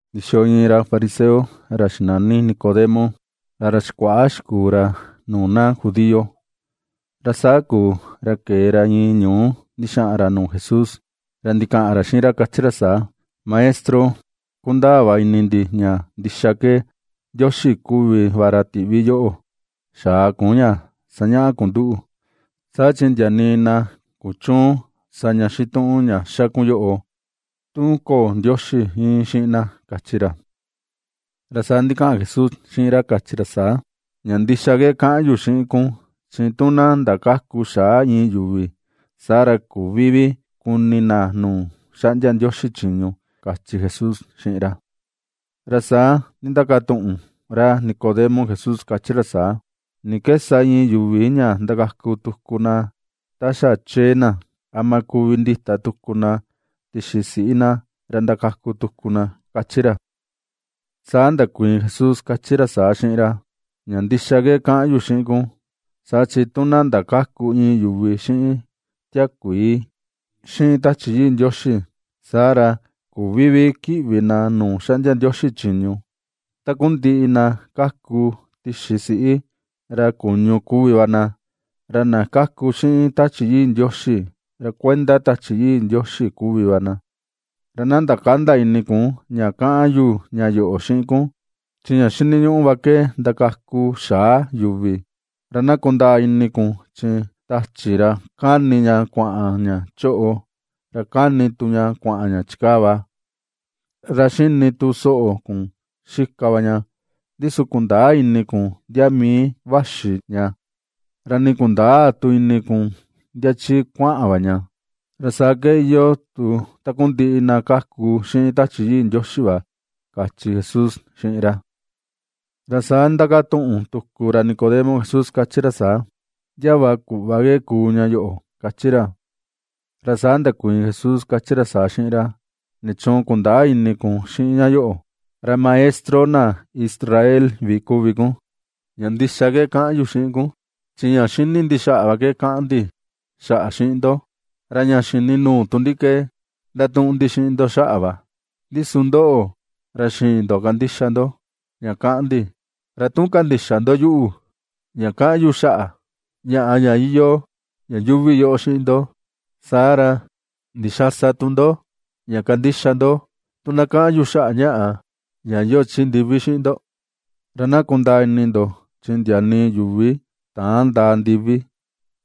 Ndixiyo iin ra fariseo ra xinani Nicodemo, ra ra xikuaꞌa xikuu ra nuu na judío. Ra saa kuu, ra kee ra iin ñuu ndixaꞌan ra nuu Jesús, ra ndikaꞌan ra xiꞌin ra kachi ra saa: ―Maestro, kundaa va ini ndi ña ndixa ke Ndioxi kuvi va ra tiꞌvi yoꞌo xaa kun ña sañaꞌa kun nduꞌu, saa chi ndia nii na kuchüun sa ña xituꞌun ña xa kun yoꞌo, tu köo Ndioxi íin xiꞌin na ―kachi ra. Ra saa ndikaꞌan Jesús xiꞌin ra kachi ra saa: ―Ña ndixa ke kaꞌan yu xiꞌin kun chi tu na ndakäku xaa iin yuvi, saa ra küvi vi kuni na nuu xaꞌndia Ndioxi chiñu ―kachi Jesús xiꞌin ra. Ra saa ndindakatuꞌun ra Nicodemo Jesús kachi ra saa: ―¿Ni ke sa iin yuvi ña ndakaku tuku na ta xa chee na? ¿Ama kuvi ndita tuku na tixi siꞌi na ra ndakaku tuku na? ―kachi ra. Saa ndakuiin Jesús kachi ra saa xiꞌin ra: ―Ña ndixa ke kaꞌan yu xiꞌin kun saa chi tu na ndakäku iin yuvi xiꞌin tiakuii xiꞌin Tachi yii Ndioxi, saa ra küvi vi kiꞌvi na nuu xaꞌndia Ndioxi chiñu. Takundiꞌi na kaku tixi siꞌi, ra kuñu kuvi vi va na, ra na kaku xiꞌin Tachi Yii Ndioxi ra kuenda Tachi Yii Ndioxi kuvi va na. Ra na ndakända ini kun ña kaꞌan yu ña yoꞌo xiꞌin kun: “Chi ña xiniñuꞌu va ke ndakaku xaa yuvi.” Ra na kundaa ini kun chi tachi ra kani ña kuaꞌan ña choꞌo ra kani tu kuaꞌan ña chikaa va, ra xini tu soꞌo kun xika va ña, ndi su kundäa ini kun ndia mii vaxi ña, ra nii kundäa tu ini kun ndia chi kuaꞌan va ña. Ra saa ke iyoo tu takundiꞌi na kaku xiꞌin Tachi Yii Ndioxi va ―kachi Jesús xiꞌin ra. Ra saa ndindakatuꞌun tuku ra Nicodemo Jesús kachi ra saa: ―¿Ndia va kuꞌva ke kuu ña yoꞌo? ―kachi ra. Ra saa ndakuiin Jesús kachi ra saa xiꞌin ra: ―¿Nichuun kundäa ini kun xiꞌin ña yoꞌo, ra maestro na Israel vi kuvi kun? Ña ndixa ke kaꞌan yu xiꞌin kun chi ña ^xíni̱ ndi xaꞌa va ke kaꞌan ndi xaꞌa xiꞌin ndo; ra ña xini nuu tu ndi ke ^ndatuꞌun ndi xiꞌin ndo xaꞌa va; ndi su ndoꞌo, ra xïin ndo kandixa ndo ña kaꞌan ndi. Ra tu kandïxa ndo yuꞌu ña kaꞌan yu xaꞌa ñaꞌa ña iyoo ña yuuvi yoꞌo xiꞌin ndo, saa ra, ¿ndixaa sa tu ndo ña kandixa ndo tu na kaꞌan yu xaꞌa ñaꞌa ña iyoo chi ndivi xiꞌin ndo? ’Ra na kundaa ini ndo chi ndia nii yuvi täan ndaa ndivi,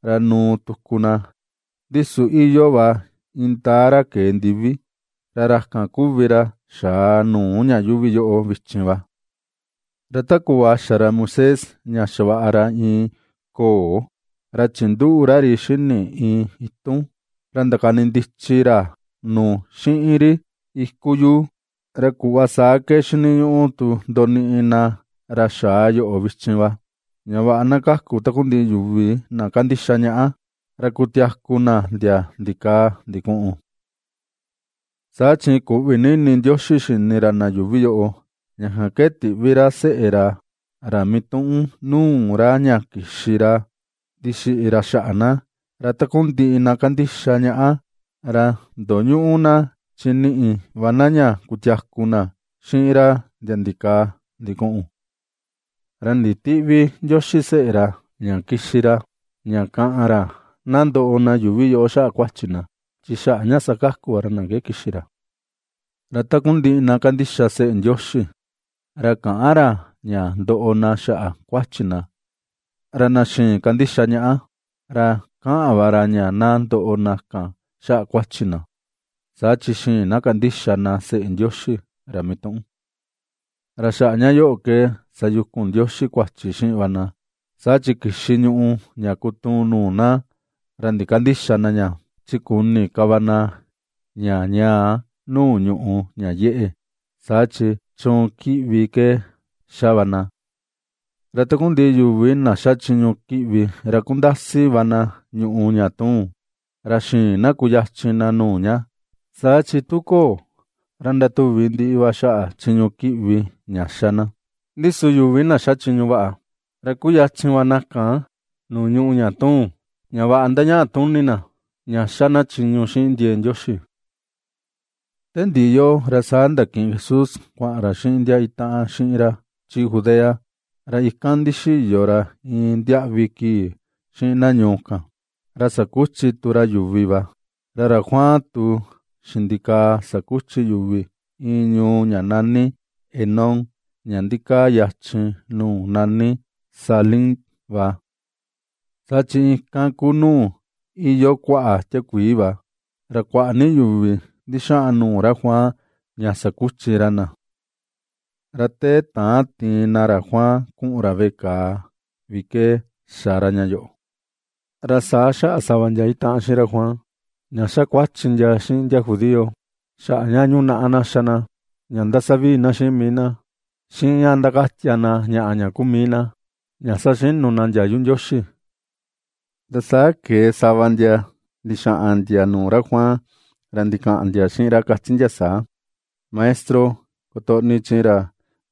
ra nuu tuku na, ndi su iyoo va indaa ra kee ndivi, ra ra kan kuvi ra xaa nuu ña yuuvi yoꞌo vichin va. Ra ta kuꞌva xa ra Moisés ña xavaꞌa ra iin ko̱o̱ ra chinduꞌu ra ri xini iin itun, ra ndakani ndichi ra nu xiꞌin ri iku yuu, ra kuꞌva saa ke xiniñuꞌu tu ndoniꞌi na ra xaa yoꞌo vichin va, ña vaꞌa na kaku takundiꞌi yuvi, na kandixa ñaꞌa, ra kutiaku na ndia ndikaa ndikuꞌun. ’Saa chi kuꞌvi ni ini Ndioxi xini ra na yuuvi yoꞌo, ña kan ke tiꞌvi ra seꞌe ra, ra mituꞌun nuu ra ña kixi ra ndixiꞌi ra xaꞌa na, ra takundiꞌi na kandixa ñaꞌa, ra ndoñüꞌu na, chi niꞌi va na ña kutiaku na xiꞌin ra ndia ndikaa ndikuꞌun. Ra nditïꞌvi Ndioxi seꞌe ra ña kixi ra ña kaꞌan ra ña na ndoꞌo na yuuvi yoꞌo xaꞌa kuachi na, chi xaꞌa ña sakaku va ra na ke kixi ra. ’Ra takundiꞌi na kandixa Seꞌe Ndioxi ra ^käꞌan ra ña ndoꞌo na xaꞌa kuachi na; ra na xïin kandixa ñaꞌa ra ^kaꞌan va ra ña na ndoꞌo na kan xaꞌa kuachi na, saa chi xïin na kandixa na seꞌe Ndioxi ra mituꞌun. Ra xaꞌa ña yoꞌo ke sayukun Ndioxi kuachi xiꞌin va na; saa chi kixi ñùꞌù ña kutuun nuu na, ra ndikandïxa na ña, chi kuni ni ka va na ña ñaa nuu ñùꞌù ña yeꞌe, saa chi chuun kiꞌvi ke ^xa va na. Ra takundiꞌi yuvi na ^xa chiñu kiꞌvi ra kundasi va na ñùꞌù ña tuun, ra xïin na kuyachin na nuu ña, saa chi tu köo, ra ndatuvi ndiꞌi va xaꞌa chiñu kiꞌvi ña xa na. Ndi su yuvi na ^xa chiñu vaꞌa, ra kuyachin va na kan nuu ñùꞌù ña tuun, ña vaꞌa ndañaꞌa tuni na ña ^xa na chiñu xiꞌin ndiee Ndioxi. Te ndiꞌi yoꞌo, ra sa ndakiꞌin Jesús kuaꞌan ra xiꞌin ndia itaꞌan xiꞌin ra chi Judea, ra ikan ndixiyo ra iin ndiaꞌvi kii xiꞌin na ñuu kan, ra sakuchi tu ra yuvi va. Ra ra Juan tu xindikaa sakuchi yuvi iin ñuu ña nani Enón ña ndikaa yachin nuu nani Salim va. Saa chi ikan ku nuu iyoo kuaꞌa tiakuii va, ra kuaꞌa ni yuvi ndixaꞌan nuu ra Juan ña sakuchi ra na. Ra te täan tiin na ra Juan kuꞌun ra veꞌe kàà vi ke xa ra ña yoꞌo. Ra saa xaꞌa sava ndia itaꞌan xiꞌin ra Juan ña xa kuachi ndia xiꞌin na judío xaꞌa ña yunaꞌa na xa na ña ndasa vii na xiꞌin mii na xiꞌin ña ndakatia na ñaꞌa ña kuu mii na ña saxinu na ndiayu Ndioxi. Ra saa kee sava ndia ndixaꞌan ndia nuu ra Juan ra ndikaꞌan ndia xiꞌin ra kachi ndia saa: ―Maestro, kutoꞌni, chi ra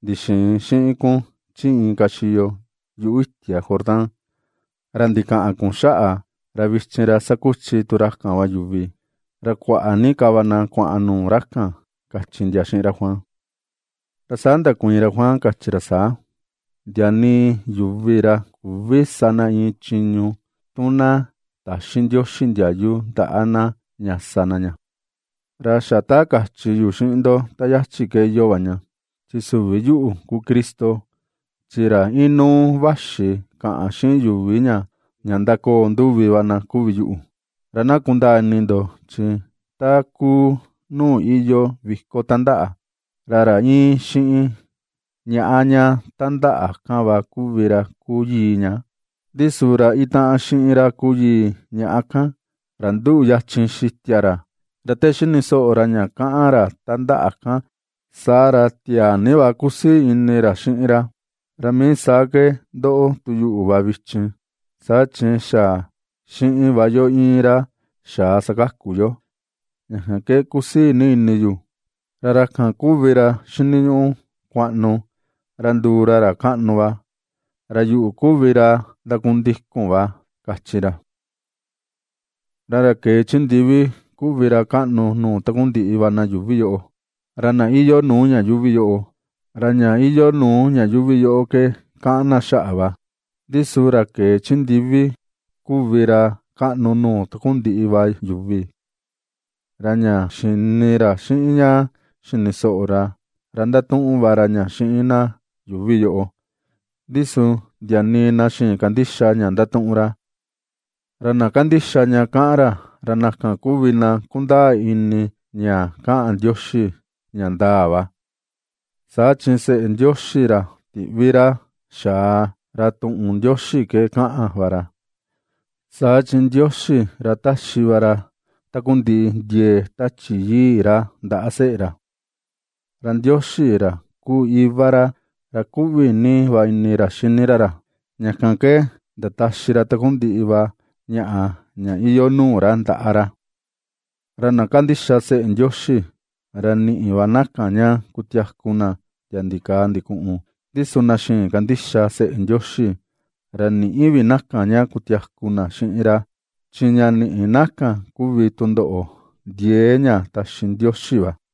ndixiin xiꞌin kun chi inka xiyo yuꞌu itia Jordán, ra ndikaꞌan kun xaꞌa, ra vichin ra ^sakuchi tu ra kan va yuvi, ra kuaꞌa ni ka va na kuaꞌan nuu ra kan ―kachi ndia xiꞌin ra Juan. Ra saa ndakuiin ra Juan kachi ra saa: ―Ndia nii yuvi ra küvi sa na iin chiñu tu na täxi Ndioxi ndiayu ndaꞌa na ña sa na ña. Ra xa ta kachi yu xiꞌin ndo ta yachi ke iyoo va ña: “Chi süvi yuꞌu ku Cristo, chi ra inuu vaxi kaꞌan xiꞌin yuvi ña ndakoo nduvi va na kuvi yu.” Ra na kundaa ini ndo, chi ta ^kuu nuu iyoo viko tandaꞌa, ra ra íin xiꞌin ñaꞌa ña tandaꞌa kan va kuvi ra kuu yii ña, ndi su ra itaꞌan xiꞌin ra kuu yii ñaꞌa kan, ra nduꞌu yachin xitia ra, ra te xini soꞌo ra ña kaꞌan ra tandaꞌa kan saa ra tiaa ni va kusii ini ra xiꞌin ra; ra mii saa ke ndoꞌo tu yuꞌu va vichin, saa chi xa xiꞌin va yo íin ra xaa sakaku yoo, ña kan ke kusii ni ini yu. Ra ra kan kuvi ra, xiniñuꞌu kuaꞌnu ra nduu ra ra kaꞌnu va, ra yuꞌu kuvi ra ndakundikun va ―kachi ra. ’Ra ra kee chi ndivi kuvi ra kaꞌnu nuu takundiꞌi va na yuuvi yoꞌo. Ra na iyoo nuu ña yuuvi yoꞌo, ra ña iyoo nuu ña yuuvi yoꞌo ke kaꞌan na xaꞌa va, ndi su ra kee chi ndivi kuvi ra kaꞌnu nuu takundiꞌi va yuvi. Ra ña xini ra xiꞌin ña xini soꞌo ra, ra ndatuꞌun va ra ña xiꞌin na yuuvi yoꞌo, ndi su ndia nii na xïin kandixa ña ndatuꞌun ra. Ra na kandixa ña kaꞌan ra, ra na kan kuvi na kundaa ini ña kaꞌan Ndioxi ña ndaa va; saa chi seꞌe Ndioxi ra tiꞌvi ra xaa, ra tuꞌun Ndioxi ke kaꞌan va ra, saa chi Ndioxi, ra taxi va ra takundiꞌi ndiee Tachi Yii ra ndaꞌa seꞌe ra. Ra Ndioxi, ra kuu iva ra, ra kuꞌvi ni va ini ra xini ra ra, ña kan ke ndataxi ra takundiꞌi va ñaꞌa ña iyoo nuu ra ndaꞌa ra. Ra na kandixa seꞌe Ndioxi, ra niꞌi va na kan ña kutiaku na ndia ndikaa ndikuꞌun; ndi su na xïin kandixa seꞌe Ndioxi, ra nïꞌi vi na kan ña kutiaku na xiꞌin ra, chi ña niꞌi na kan kuvi tundoꞌo ndiee ña taxi Ndioxi va.